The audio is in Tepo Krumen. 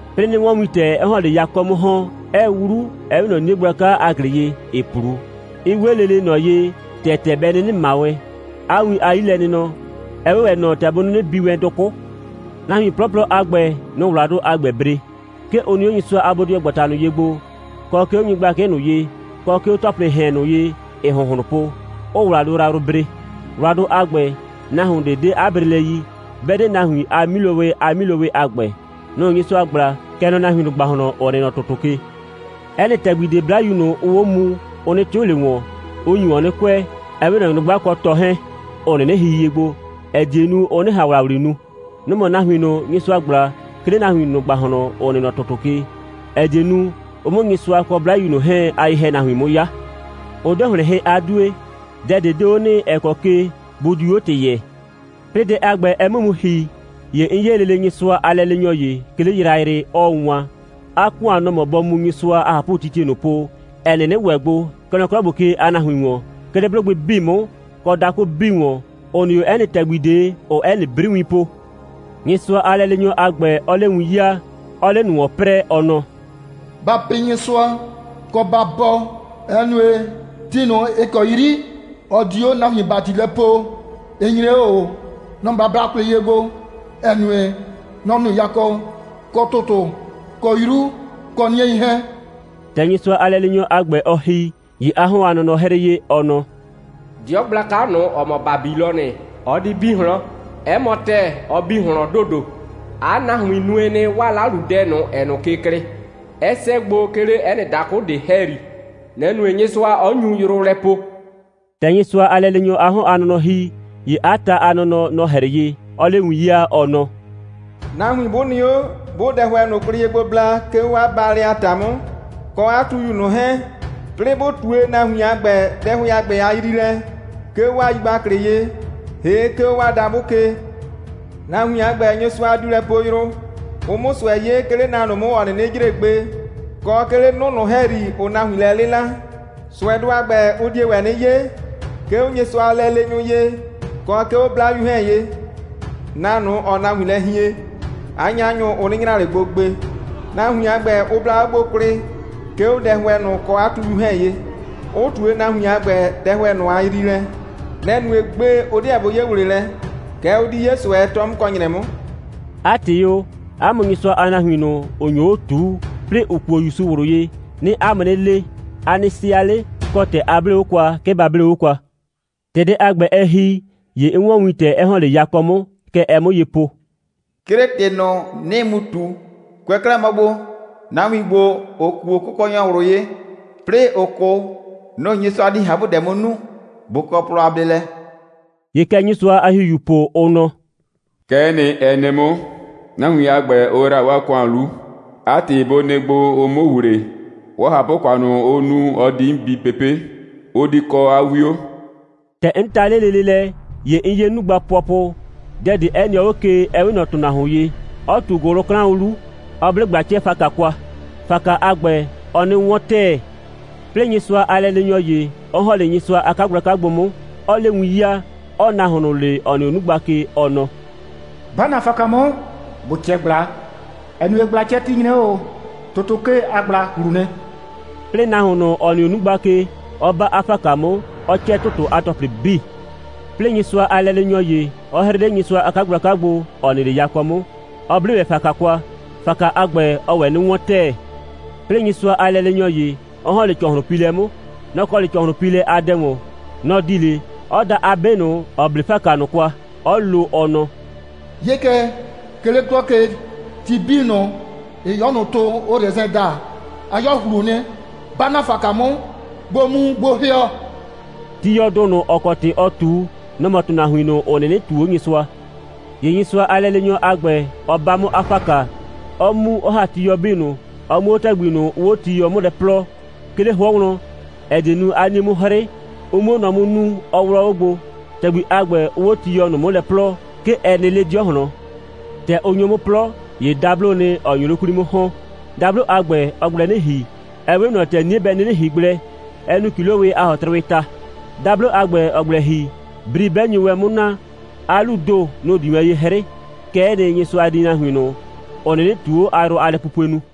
'Plɩɩ 'nɩ 'wɔn wintɛ, 'ɛɛ 'le yakɔ 'mʋ ‑hɔn, 'ɛɛ 'wlu, ‑ɛ 'we ꞊nɔ 'nie gblaka a ‑glɩ ye, ‑ɩɩ 'plu, 'ɛ 'we lele ꞊nɔ ye, ‑tɛ ‑tɛ bɛ 'nɩnɩ ꞊ma wɛn. 'A win a 'yilɛnɩnɔ, ɛ 'we ‑wɛ ꞊nɔ ‑tɛ bʋ 'nɩnɩ bi wɛn dʋkʋ'. Nahuin 'plɔplɔ a ‑gbɛ, nʋ‑ʋ ‑wladʋ a ‑gbɛ bre. 'Ke ʋ nɩ 'o Nyɩsʋa a bodɩɔgbata ꞊nʋ ye gbo, kɔ, 'ke 'o nyɩgblakɩ ꞊nʋ ye, kɔ, 'ke 'o ‑tɔplɩɩ ‑hɛn ꞊nʋ ye, ‑ɩɩ ‑hʋnhlʋn po, 'ʋʋ ‑wladʋ yrayrʋ bre. ‑Wladʋ a ‑gbɛ, nahuon ꞊de 'de 'a brelɛ yi, 'bɛ 'de nahuin a 'milowɩ a 'milowɩ a ‑gbɛ. Nʋ‑ Nyɩsʋa ꞊gbla, kɛ nɔ nahuin ꞊nʋ ‑gbahlɔn, ‑ʋ nɩ nɔ ‑tʋtʋ ke. 'Ɛ nɩ ‑tɛgbi ꞊de, 'Blayu ꞊nʋ, ʋʋ 'o muu, ʋ 'nɩ 'tɩʋ ꞊le ‑wɔn, 'ʋ nyu ‑wɔn kʋɛ, ‑ɛ 'we ꞊nɔ nyrʋgba kɔ tɔ 'hɛɛn, ‑ʋ 'nɩnɩ hihie gbo, ‑ɛ die nu, ʋ 'nɩ ꞊han ‑wlawli nu. Nʋ‑ mɔ nahuin ꞊nʋ, Nyɩsʋa ꞊gbla, 'ke 'le nahuin ꞊nʋ ‑gbahlɔn, ‑ʋ nɩ nɔ ‑tʋtʋ ke, ‑ɛ die nu, ʋ 'mʋ Nyɩsʋa kɔ 'Blayu ꞊nʋ 'hɛɛn a ye‑hɛnahuin 'mʋ 'ya. Ʋ 'de ‑hlɩn hɩ a 'due. Dɛ ꞊de 'de 'o nɩ, ‑ɛ kɔ ke bʋ diu 'o ‑tɩ yɛɛ. 'Plɩɩ dɛ a ‑gbɛ, ɛ 'mʋ mu ‑hi, ‑ye 'n 'ye lele Nyɩsʋa a lɛleenyɔ ‑ye, 'ke 'le yrayrɩ, 'ɔɔ wan. 'A ‑kʋan, nɔ‑ mɔ bɔ mu Nyɩsʋa a ꞊hapʋtitie ꞊nʋ po, ‑ɛ 'nɩnɩ ‑wɛ gbo, kɛ nɔ 'klɔ ‑gbo ke a nahuin ‑wɔn, 'ke 'le 'blʋgbɩ 'bii 'mʋ, kɔ dakʋ 'bii ‑wɔn, ‑ʋ nɩ 'o 'ɛ nɩ ‑tɛgbi ꞊de, ‑ʋʋ 'ɛ nɩ 'briwin po; Nyɩsʋa a lɛleenyɔ a ‑gbɛ 'ɔɔ 'le win 'yaa, 'ɔɔ 'le ꞊nʋ ‑wɔn 'prɛɛ, ɔ nɔ: «Ba pɩ Nyɩsʋa, kɔ, ba bɔɔ, ‑ɛ nue, ti ꞊nʋ, ‑ɩ kɔ 'yri ɔ di 'o nahuin ‑bati lɛ poo, ɩ nyre 'o ꞊o. Nɔ‑ ba bla kwlɩ ye gbo, ‑ɛ nue, nɔ‑ nu yakɔ, kɔ ‑tʋtʋ, kɔ 'yru, kɔ 'niei 'hɛɛn.» ‑Tɛ Nyɩsʋa a lɛleenyɔ a ‑gbɛ, ɔ ‑hi, ‑ye 'a 'hɔn a nɔnɔ 'hrɩɩ ye, ɔ nɔ: «'Dɩɔ gblaka ꞊nʋ, ‑ɔ mɔ Babilɔnɩ, ɔ di bi ꞊hlɔn. 'Ɛ mɔ ‑tɛɛ, ɔ bi ꞊hlɔn ‑dodo. 'A nahuin nue nɩ, 'waa 'laludɛ ꞊nʋ, ‑ɛɛ ꞊nʋ ke klɩɩ, 'ɛ 'sɛɛ gbo, 'ke 'le 'ɛ nɩ dakʋ ꞊de ‑hɛyri, nɛ‑ nue, Nyɩsʋa 'ɔ nyu yrʋ lɛ poo.» ‑Tɛ Nyɩsʋa a lɛleenyɔ a 'hɔn a nɔnɔ ‑hi, ‑ye 'a ta a nɔnɔ, nɔ‑ 'hrɩɩ ye, 'ɔɔ 'le win 'yaa, ɔ nɔ: «Nahuin 'bʋ nɩ 'o, 'bʋʋ dɛhʋɛ ꞊nʋ kwlɩ ye gbo bla, 'ke 'o 'a baalɛ a ‑ta 'mʋ, kɔ 'a tuyu ꞊nʋ 'hɛɛn, 'plɩɩ 'bʋ ꞊tue nahuin a ‑gbɛ dɛhʋɛ a ‑gbɛ a yriilɛ, 'ke 'o 'waa yigbaklɩ ye, ‑hee' 'ke 'o 'waa dabʋ ke, nahuin a ‑gbɛ, Nyɩsʋa diu lɛ poo yrʋ, ʋ 'mʋ ꞊sʋɛ 'ye, 'ke 'le na ꞊nʋ 'mʋ, ‑ɔ 'nɩnɩ jre gbe, kɔ 'ke 'le 'nʋ ꞊nʋ ‑hɛyri, ‑ʋʋ nahuin lɛ 'lɩla. ꞊Sʋɛdʋ a ‑gbɛ, ʋ die ‑wɛ 'nɩ 'ye, 'ke 'o Nyɩsʋa a lɛleenyʋ ye, kɔ 'ke 'o 'Blayu 'hɛɛn ye. Na ꞊nʋ, ‑ʋʋ nahuin lɛ hien, 'a 'nyanyʋ, ʋ 'nɩ nyra ꞊le gbo gbe. Nahuin a ‑gbɛ, ʋ bla o gbo kwlɩ, 'ke 'o dɛhʋɛ ꞊nʋ kɔ 'a tuyu 'hɛɛn ye, 'ʋ ꞊tue nahuin a ‑gbɛ dɛhʋɛ ꞊nʋ a yriilɛ. Nɛ‑ nue, gbe, ʋ 'deɛ bʋ 'ye ‑wleelɛ, kɛɛ, ʋ di 'ye ꞊sʋɛ, 'tɔ 'mʋ kɔ ‑nyrɛ 'mʋ.» 'A ‑tɩ o, 'a mʋ Nyɩsʋa a nahuin ꞊nʋ, ‑ʋ nyo 'o ꞊tuu, 'plɩɩ ‑ʋ kuo ‑Yusu ꞊wlʋ ye, 'nɩɩ 'a mʋ 'nɩ le: A nɩ sɩa 'le, kɔ, ‑tɛ a 'blee 'o kwa, 'ke ba 'blee 'o kwa. ‑Tɛ dɛ a ‑gbɛ, ɛ ‑hi, ‑ye 'n 'wɔn wintɛ, 'ɛ ‑hɔn 'le yakɔ 'mʋ. Kɛ ɛɛ 'mʋ ye po: «'Crɩɩ ‑tɩ ꞊nʋ, 'nɩɩ mu ꞊tu: Kʋɛ 'klɛɛ mɔ gbo, nahuin ‑gbo, ‑ʋ kuo Kʋkɔnyɔ ꞊wlʋ ye, 'plɩɩ ‑ʋʋ 'kʋ, nʋ‑ Nyɩsʋa di ꞊hapʋdɛ 'mʋ nu. Bʋ kɔ plɔ a bleelɛ.» ‑Ye kɛ Nyɩsʋa a ‑Hihiuu po, ʋ nɔ: «Kɛ'ɛ nɩ, ɛ nɩ 'mʋ. Nahuin a ‑gbɛ, ʋ ‑yra 'waa ‑kʋan 'lu. 'A ‑tɩ, bʋ nɩ gbo, ʋ 'mʋ ‑wle. 'Waa ꞊hapʋ‑kʋan ꞊nʋ, ʋ nu, ɔ di 'mʋ bi pepe'. Ʋ di kɔ 'a 'wio.» ‑Tɛ 'n ta 'le lele lɛ, ‑ye 'n 'ye 'nugba pʋɔpʋ, dɛ ꞊de 'ɛ nɩɔ 'o ke, 'ɛ 'we ꞊nɔ ‑tʋnahuon ye, 'ɔ ꞊tu ‑gʋlʋklaʋn 'lu, 'ɔ 'ble ꞊gbla'cɛɛ‑faka kwa. ‑Faka a ‑gbɛ, ɔɔ 'nɩ 'wɔn ‑tɛɛ. 'Plɩɩ, Nyɩsʋa a lɛleenyɔ ‑ye, 'ɔ ‑hɔn 'le Nyɩsʋa a 'kagblaka gbo 'mʋ, 'ɔɔ 'le win 'yaa, 'ɔɔ nahuon ꞊nʋ le, ‑ɔ nɩ 'o 'nugba ke, ɔ nɔ: «'Ba ‑na ‑faka 'mʋ, ‑bo 'cɛ ꞊gbla, ‑ɛ nue, ꞊gbla'cɛti nyre 'o ꞊o. ‑Tʋtʋ ke a ꞊gbla ꞊hlu nɩ.» 'Plɩɩ nahuon ꞊nʋ, ‑ɔ nɩ 'o 'nugba ke, 'ɔ 'ba 'a ‑faka 'mʋ, 'ɔ 'cɛ ‑tʋtʋ a ‑tɔplɩ 'bii. 'Plɩɩ, Nyɩsʋa a lɛleenyɔ ‑ye, 'ɔ 'hrɩɩ 'le Nyɩsʋa a 'kagblaka gbo, ‑ɔ nɩ 'le yakɔ 'mʋ, 'ɔ 'ble ‑wɛ ‑faka kwa. ‑Faka a ‑gbɛ, ɔɔ ‑wɛ 'nɩ 'wɔn ‑tɛɛ. 'Plɩɩ, Nyɩsʋa a lɛleenyɔ ‑ye, 'ɔ ‑hɔn 'le ‑cɔhlʋnpiilɛ 'mʋ. Nɔ‑ kɔ 'le ‑cɔhlʋnpiilɛ a dɛ ‑wɔn. Nɔ‑ di 'le, 'ɔ da 'a 'be ꞊nʋ, ‑ɔ 'ble ‑faka ꞊nʋ kwa, 'ɔ lo, ɔ nɔ: «'Ye kɛ, 'ke 'le 'klɔ ke, ti 'bii ꞊nʋ, ‑ɩɩ 'yɔ ꞊nʋ tʋ, ʋʋ rɛsɛn daa, 'a 'yɔ ꞊hlu nɩ. 'Ba ‑na ‑faka 'mʋ, ‑bo mu ‑bo ‑hɩɔ.» (Tiyɔdʋ ꞊nʋ, ‑ɔ kɔ ‑tɩ ɔɔ ꞊tu, nɔ‑ mɔ ‑tʋnahuin ꞊nʋ, ‑ʋ 'nɩnɩ ꞊tuu 'o Nyɩsʋa.) ‑Ye Nyɩsʋa a lɛleenyɔ a ‑gbɛ, ɔ 'ba 'mʋ 'a ‑faka, 'ɔ mu, 'ɔ ‑ha tiyɔ 'bii ꞊nʋ, 'ɔ mu 'o ‑tɛgbi ꞊nʋ, ʋʋ 'o tiyɔ 'mʋ lɛ 'plɔɔ, 'ke 'le 'hʋɔ wlɔn, ‑ɛ die nu, 'a 'nie 'mʋ 'hrɩ, ʋ 'mue nɔ 'mʋ nuu, 'ɔ 'wlɔ 'o gbo. ‑Tɛgbi a ‑gbɛ, ʋʋ 'o tiyɔ ꞊nʋ 'mʋ lɛ 'plɔɔ, 'ke ɛ nɩ 'le 'dɩɔ ꞊hlɔn. ‑Tɛ ʋ nyo 'mʋ 'plɔ, ‑ye dabloo nɩ, ‑ɔ nyo 'le 'kwli 'mʋ ‑hɔn. Dablo a ‑gbɛ, ɔɔ gblɛ 'nɩ ‑hi, ‑ɛ 'we ꞊nɔ ‑tɛ 'nie bɛ 'nɩnɩ ‑hi gblɛ, 'ɛ nu ‑kilowɩ a ‑hɔtrʋwɩɩ ta. Dablo a ‑gbɛ, ‑ɔɔ gblɛ ‑hi, bri 'bɛ nyo wɛn 'mʋ na, 'a 'luu ‑do, nʋ‑ di wɛn ye 'hrɩɩ. Kɛ'ɛ nɩ, Nyɩsʋa di nahuin ꞊nʋ, ‑ʋ 'nɩnɩ ꞊tuo 'o a yrʋ a lɛpupue nu.